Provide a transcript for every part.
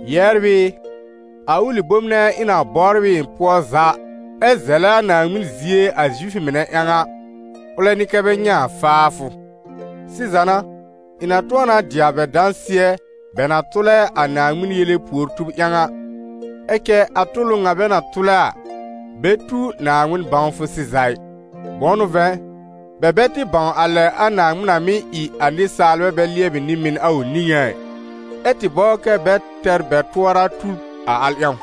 Yɛbr ɩ, a ʋlɩ bom nɛ ɩ̃ na bɔbr ɩ ɩ̃ pʋɔ za, ɛ zɛlɛ a Naaŋmɩn zie a Zifʋ mɩnɛ ƴãw a, ʋlɛ n'ɩ kɛ́ bɛ nyɛ̃ a faafʋ. Sɩza n'a, ɩ̃ na tʋ̃ɔ na dɩ a bɛ dãsɩɛ bɛ na tʋlɛ a Naaŋmɩn yele puor-tub ƴãw a, ɛ cɛ a tʋlʋ ŋa bɛ na tʋlɛ a, bɛ tu Naaŋmɩn bãwfʋ sɩza ɩ. Bʋ̃ʋ n'ʋ vɛ̃, bɛ bɛ tɩ bãw a lɛ a Naaŋmɩn na mɩ́ ɩ a nɩsaalbɛ bɛ lɩɛbɩ nɩ-mɩn a ʋ niŋé a ɩ, ɛ́ tɩ bɔbr kɛ bɛ tɛr bɛ tʋɔra tub a al ƴãw.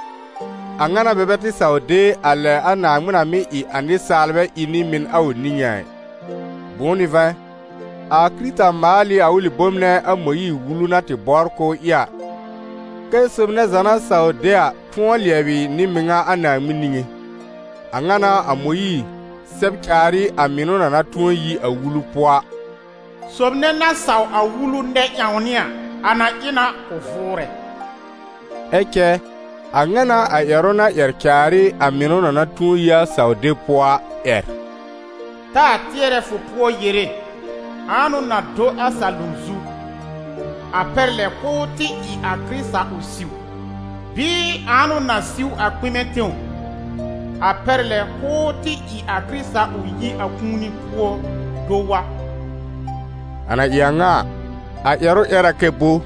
A ŋa n'a bɛ bɛ tɩ saw de a lɛ a Naaŋmɩn na mɩ́ ɩ a nɩsaalbɛ ɩ nɩ-mɩn a ʋ niŋé a ɩ. Bʋ̃ʋ n'ʋ vɛ̃, a Kɩrɩta maal ɩ a ʋlɩ bom nɛ a Mõyiir-Wulu na tɩ bɔbr k'ʋʋ ɩ a, kɛ́ sob nɛ za na saw de a tʋ̃ɔ lɩɛbɩ nɩ-mɩŋa a Naaŋmɩn niŋé. A ŋa n'a a Mõyiir sɛb caar ɩ a mɩnʋ na na tʋ̃ɔ yi a Wulu pʋɔ a: «Sob nɛ na saw a Wulu nɛ-ƴãwnɩ a, a na ɩ na k'ʋ vʋʋrɛ.» Ɛ cɛ a ŋa n'a a ƴɛrʋ na ƴɛr caar ɩ a mɩnʋ na na tʋ̃ɔ yi a saw-deb pʋɔ a ƴɛr: «Taa tɩɛrɛ fʋ pʋɔ yere: Ãa n'ʋ na do a salom zu?» (A pɛr lɛ k'ʋʋ tɩ ɩ a Kɩrɩta ʋ siw). Bɩɩ: «Ãa n'ʋ na siw a kpɩmɛ tẽw?» (A pɛr lɛ k'ʋʋ tɩ ɩ a Kɩrɩta ʋ yi a kũuni pʋɔ do wa). A na ɩ a ŋa a, a ƴɛrʋ ƴɛr a kɛ bo?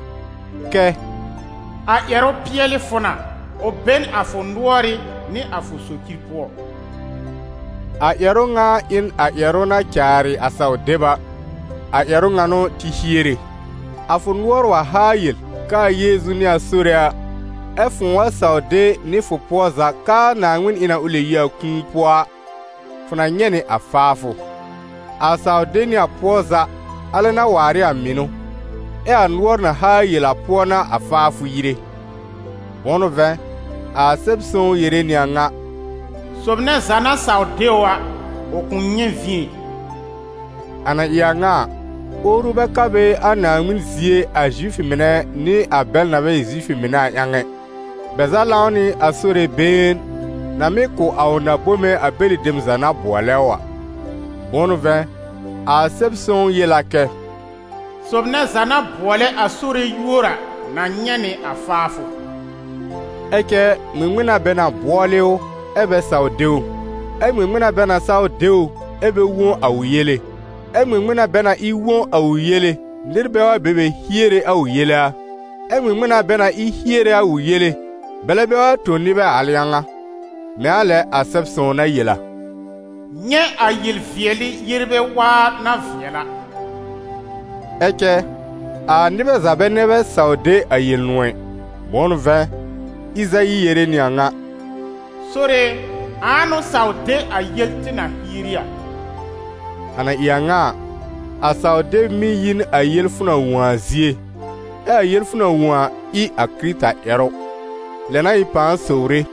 Kɛ: «A ƴɛrʋ pɩɛl ɩ fʋ na, ʋ be n a fʋ nʋɔrɩ́ nɩ a fʋ socir pʋɔ.» A ƴɛrʋ ŋa ɩ n a ƴɛrʋ na caarɩ a saw-deb a, a ƴɛrʋ ŋa n'ʋ tɩ hiere. A fʋ nʋɔr wa haa yel k'aa Yeezu n'ɩ a Sore a, ɛ́ fʋ̃ʋ wa saw de nɩ fʋ pʋɔ za k'aa Naaŋmɩn ɩ na k'ʋ lɛb yi a kũuni pʋɔ a, fʋ na nyɛ̃ nɩ a faafʋ. A saw de nɩ a pʋɔ za, alɛ n'a waar ɩ a mɩnʋ, ɛ a nʋɔr na haa yel a pʋɔ n'a a faafʋ yire. Bʋ̃ʋ n'ʋ vɛ̃, a Sɛb-sõw yere nɩ a ŋa: «Sob nɛ za na saw de ʋ a, ʋ kʋ̃ nyɛ̃ vĩ ɛ.» A na ɩ a ŋa a, owru bɛ ka a Naaŋmɩn zie a Zifʋ mɩnɛ nɩ a bɛl na bɛ ɩ Zifʋ mɩnɛ a ƴãw ɛ: bɛ za lãw nɩ a Sore been, na mɩ́ kʋ̀ a ʋ na-bome a bɛlɩ dem za na bʋɔlɛ ʋ a. Bʋ̃ʋ n'ʋ vɛ̃, a Sɛb-sõw yel a kɛ: «Sob nɛ za na bʋɔlɛ a Sore yúor a na nyɛ̃ nɩ a faafʋ.» Ɛ cɛ ŋmɩŋmɩn n'a bɛ na bʋɔlɩ ʋ, ɛ́ bɛ saw de ʋ? Ɛ ŋmɩŋmɩn n'a bɛ na saw de ʋ, ɛ́ bɛ wõ a ʋ yele? Ɛ ŋmɩŋmɩn n'a bɛ na ɩ wõ a ʋ yele, nɩr bɛ wa be be hiere a ʋ yele a? Ɛ ŋmɩŋmɩn n'a bɛ na ɩ hiere a ʋ yele, bɛlɛ bɛ wa tõ nɩbɛ a al ƴãw a? Mɛ̃ a lɛ a Sɛb-sõw na yel a: «Nyɛ̃ a yel-vɩɛlɩ yerbɛ waa na vɩɛl a!» Ɛ cɛ a nɩbɛ za bɛ nɛ bɛ saw de a Yel-nʋ̃ɔ̀ ɩ. Bʋ̃ʋ n'ʋ vɛ̃, Ɩzayi yere nɩ a ŋa: «Sore e, ãa n'ʋ saw de a yel tɩ na hieri a?» A na ɩ a ŋa a, a saw-deb mɩ́ yi n a yel fʋ na wõ a zie, ɛ a yel fʋ na wõ a, ɩ a Kɩrɩta ƴɛrʋ. Lɛ n'a ɩ̃ pãa sowre: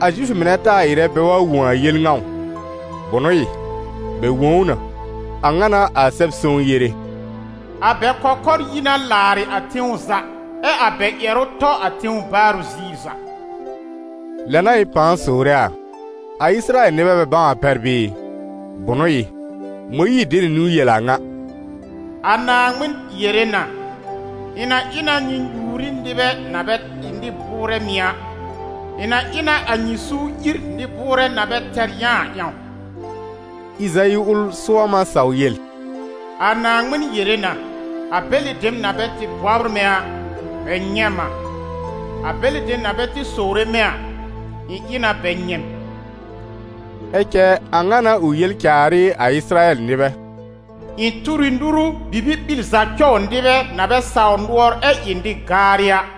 a Zifʋ mɩnɛ taa ɩrɛ bɛ wa wõ a yel ŋa ʋ? Bʋnʋ ɩ, bɛ wõ ʋ na! A ŋa n'a a Sɛb-sõw yere: «A bɛ kɔkɔr yi na làarɩ̀ a tẽw za, ɛ a bɛ ƴɛrʋ tɔ a tẽw baarʋ ziir za.» Lɛ n'a ɩ̃ pãa sowre a: a Ɩsɩrayɛl nɩbɛ bɛ bãw a pɛr bɩɩ? Bʋnʋ ɩ, Mõyiir de nɩ niwn yel a ŋa: «A Naaŋmɩn yere na: Ɩ̃ na ɩ na nyɩ nyuur ɩ nɩbɛ na bɛ ɩ nɩ-bʋʋrɛ mɩ̀ a, ɩ̃ na ɩ na a nyɩ suur ír nɩ-bʋʋrɛ na bɛ tɛr yã a ƴãw.» Ɩzayi ʋl sʋɔm a saw yel: «A Naaŋmɩn yere na: A bɛlɩ dem na bɛ tɩ bɔbr mɛ̃ a, bɛ nyɛ̃ m a, a bɛlɩ dem na bɛ tɩ sowre mɛ̃ a, ɩ̃ ɩ na bɛ nyɛ̃ m.» Ɛ cɛ a ŋa n'a ʋ yel caar ɩ a Ɩsɩrayɛl nɩbɛ: «Ɩ̃ tur ɩ nuru bibi-ɓil za cɔw nɩbɛ na bɛ sawr nʋɔr ɛ ɩ nɩ-gaarɩ a.»